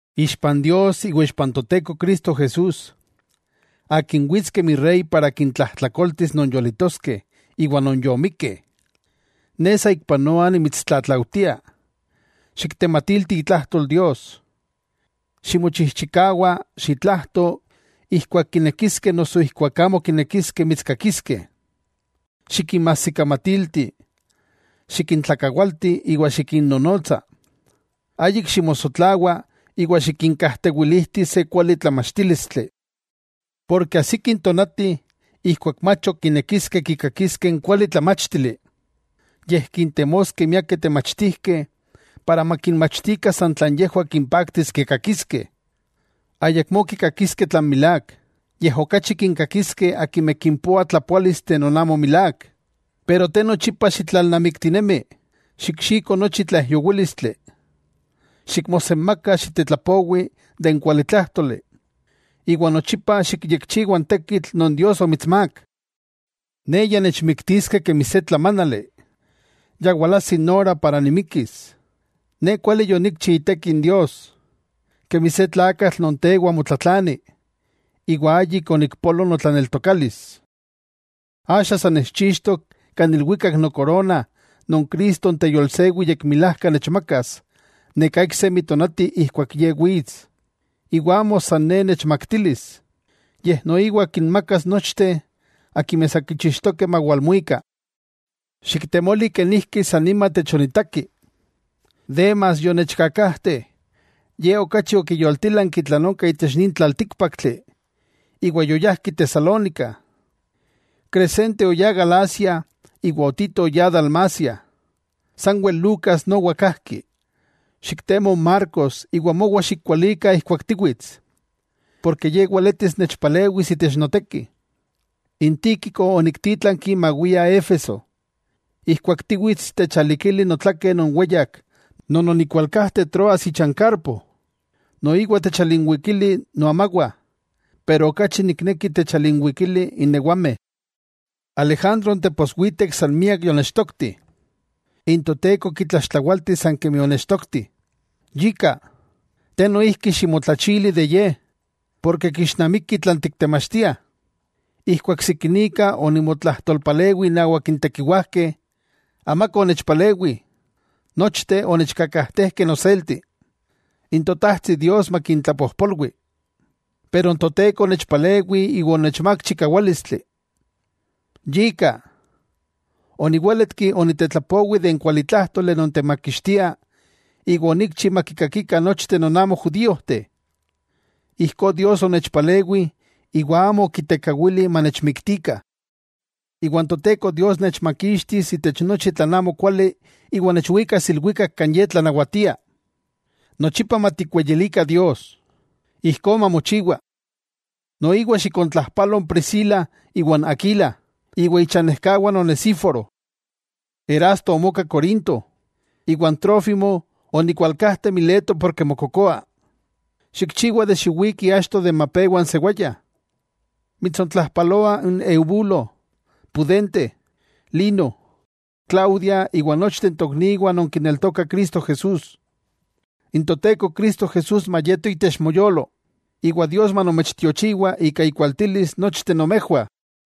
Ixpan Dios iwa ixpa n Toteko Cristo Jesús, Akin wits kemi Rey para kintlajtlakoltis non yolitoskeh iwa non yomikkeh, ne saikpanoa nimitstlatlaujtia, xiktematilti itlajtol Dios. Ximochijchikawa xitlajto ijkuak kinekiskeh noso ijkuak amo kinekiskeh mitskakiskeh. Xikinmajsikamatilti, xikintlakawalti iwa xikinnonotsa, ayik ximosotlawa iwa xikinkajtewilijti se kuali tlamachtílistli. Porke ajsiki n tonati ijkuak mach ok kinekiskeh kikakiskeh n kuali tlamáchtili, yej kintemoskeh miakeh temachtijkeh para makinmachtikah san tlan yejwah kimpaktis kikakiskeh. Ayakmó kikakiskeh tlan milák, yej okachi kinkakiskeh akimeh kimpoah tlapoálisteh non amo milák. Pero te nochipa xitlalnamiktinemi, xikxiko nochi tlaijyowílistli, xikmosenmaka xiktetlapowi n kualitlájtoli, iwa nochipa xikyekchiwa n tekitl non Dios omitsmák. Ne ya nechmiktiskeh kemi se tlamánali. Ya walajsi n ora para nimikis. Ne kuali yonikchi iteki n Dios, kemi se tlakatl non tewa motlatlani, iwa ayik onikpolo notlaneltokalis. Axa sa nechchixtok kan ilwikak nokorona non Cristo n teyolsewi yekmilajka nechmakas neká iksemi tonati ijkuak Ye wits. Iwa amo san ne nechmaktilis, yej noiwa kinmakas nochteh akimeh sa kichixtokeh mawalmuika. Xiktemoli kenijki san nima techonitaki. Demas, yonechkakajte, ye okachi okiyoltilanki tlan onka itech nin tlaltíkpaktli iwa yoyajki Tesalónica. Crescente oyá Galacia iwa Tito oyá Dalmacia. Sanwel Lucas nowa kajki. Xiktemo n Marcos iwa mowa xikwalika ijkuak tiwits, porke ye weletis nechpalewis itech noteki. N Tíquico oniktítlanki mawia Éfeso. Ijkuak tiwits, techalikili notlakeh non weyak non onikualkajte Troas icha n Carpo. Noiwa techalinwikili noamawah, pero okachi nikneki techalinwikili n ewameh. Alejandro n teposwitek san miak yonechtokti, n Toteko kitlaxtlawaltis san kemi onechtokti. Yika, te noijki ximotlachili de ye, porke kixnamiki tlan tiktemachtiah. Ijkuak sikinika onimotlajtolpalewi innawak n tekiwajkeh, amaka onechpalewi, nochteh onechkakajtejkeh noselti. N Totajtsi Dios makintlapojpolwi. Pero n Toteko onechpalewi iwa onechmák chikawálistli. Yika, oniwéletki onitetlapowi de n kualitlájtoli non temakixtia iwa onikchi makikakikah nochteh non amo judíojteh. Ijkó Dios onechpalewi iwa amo okitekawili manechmiktikah. Iwa n Toteko Dios nechmakixtis itech nochi tlan amokuali iwa nechwikas ilwikak kan Ye tlanawatia. ¡Nochipa matikweyilikah Dios! Ijkó mamochiwa. Noiwa xikontlajpalo n Priscila iwa n Aquila, iwa ichanejkawah n Onesíforo. Erasto omoka Corinto, iwa n Trófimo onikualkajte Mileto ken mokokoa. Xikchiwa xiwiki achto de mapewa n sewaya. Mitsontlajpaloah n Eubulo, Pudente, Lino, Claudia iwa nochteh n tokniwah non kineltokah Cristo. N Toteko Cristo Jesús mayeto itech moyolo, iwa Dios manomechtiochiwa ika ikualtilis nochteh nomejwah.